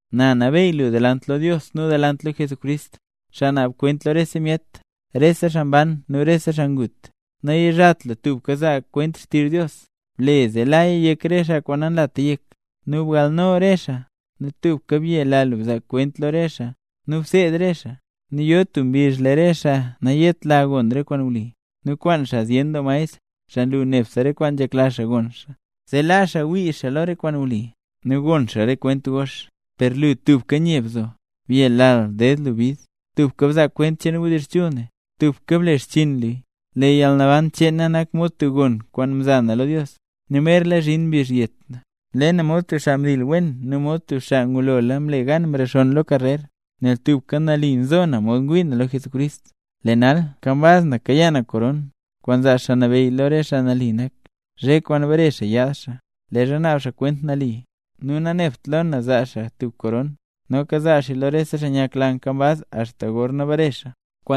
Na nabeey lu delant lo Dios nu delant lo Jesucrist, xaa naab kwent lo rese myet, rese xaa mban nu rese xaa ngut, nayizhat lu tubka zaa kwent xtizh Dios. Ble zee laya yek re xaa kwaan nanlata yek, nu bgalno re xaa, nu tubka byela lu bzaa kwent lo re xaa, nu bseeda re xaa. Nel yo tub mbizh lee re xaa nayetla gon re kwaan wli; nu kwaan xaa zyen doo maestr, xaa nlu nebse re kwaan nzhekla xaa gon xaa, zee laa xaa wii xaa lo re kwaan wli, nu gon xaa re kwent gox. Per lu tubka nye bzo, byelal ded lu bid, tubka bzaa kwent cheen wdizh chul ne, tubka ble xchiin luya. Lee yalnaban cheen na nak mod tub gon kwaan mza na lo Dios, nu merla zhin mbizh yet na. Mle na mod tub xaa mdil wen nu mod tub xaa ngulola mle gan mrexonn lo karrer, nel tubka nali nzo na mod ngwii na lo Jesucrist. Lee nal nkambaz na kayaa na koron, kwaan zaa Xaa Nabeyy lo re xaa nali nak, zhe kwaan bare xaa yaad xaa, leezha naab xaa kwent nali. Nu nanebt lo na, zaa xaa tub koron, noka zaa xaaya lo re xaa nyakla nkambaz axta gorna bare xaa.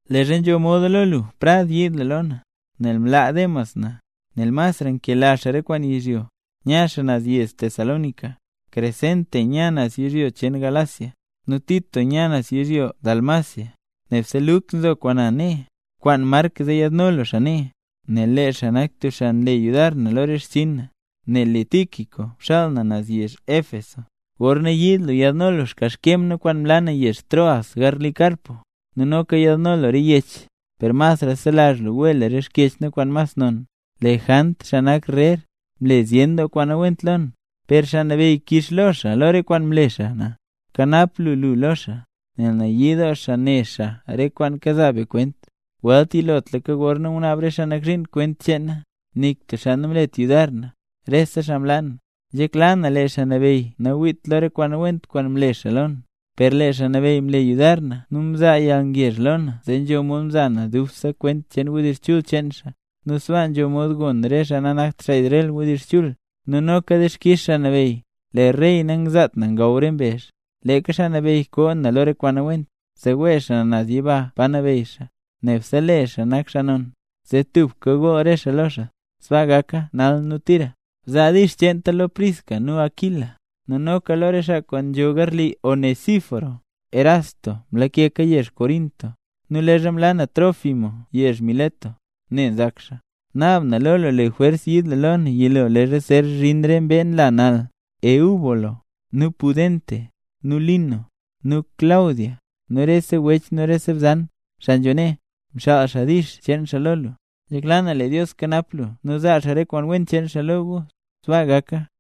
Leezha nzho moda lo lu, prad yiid lu lo na. Nel mlaa Demas na, nel masra nkela xaa re kwaan yizhyo, nya xaa naz yezh Tesalónica. Wech Crescente nya naz yizhyo cheen Galacia, nu Tito nya naz yizhyo Dalmacia. Nebse Luk nzo kwaan na nee. Bkwaan Mark zee yaadno lu xaa nee, nel lee xaa nak tub xaa nle yudar na lo re xchinn na. Nu lee wech Tíquico mxaal na naz yezh Éfeso. Gorna yiid lu, yaadno lu xkaxkem na kwaan mlaa na yezh Troas garli Carpo, nu noka yaadno re yech, per masra selazh lu wee lu re xkyech na kwaan mas non. Lee Jant, xaa nak rer, mle zyen doo kwaan nawent lo na; per Xaa Nabeyy kix lo xaa lo re kwaan mle xaa na. Kanap lu lu lo xaa, nel nayii doo xaa ne xaa re kwaan kazaa be kwent. Welt yilotlaka gorna ngunaab re xaa nak zhiin kwent cheen na, nik tub xaa namlet yudar na, rese xaa mlaa na. Nzhekla na lee Xaa Nabeyy nawiit lo re kwaan nawent kwaan mle xaa lo na. Per lee Xaa Nabeyy mle yudar na nu mzaa xaa yalngezh lo na zee nzho mod mza na dubse kwent cheen wdizh chul cheen xaa, nu sbaa nzho mod gon re xaa nanakt xaa Israel wdizh chul. Nu noka dixkix Xaa Nabeyy, lee rey nangzaat na ngaw re mbezh. Leeka Xaa Nabeyy koo na lo re kwaan nawent, zee wee xaa na naz yiba pa nabeyy xaa. Nebse lee xaa nak xaa non, zee tubka gool re xaa lo xaa. ¡Sbaa gaka nal nu tira! Bzaa “dix” cheenta lo Priscila nu lo sa me Aquila, nu noka lo re xaa nzho garli Onesíforo. Wech Erasto mlakeka yezh Corinto, nu leezha mlaa na Trófimo yezh Mileto, ne nzak xaa. Naab na lo lu, le lu jwers yiid lu lo na yilo leezha zer zhin re mbee nla nal. Eubulo, nu Pudente, nu Lino, nu Claudia, nu rese wech nu rese bzan, xaa nzho nee, mxaal xaa “dix” cheen xaa lo lu. Nzhekla na lee Dios kanap lu nu zaa xaa re kwaan wen cheen xaa lo gu. Sbaa gaka.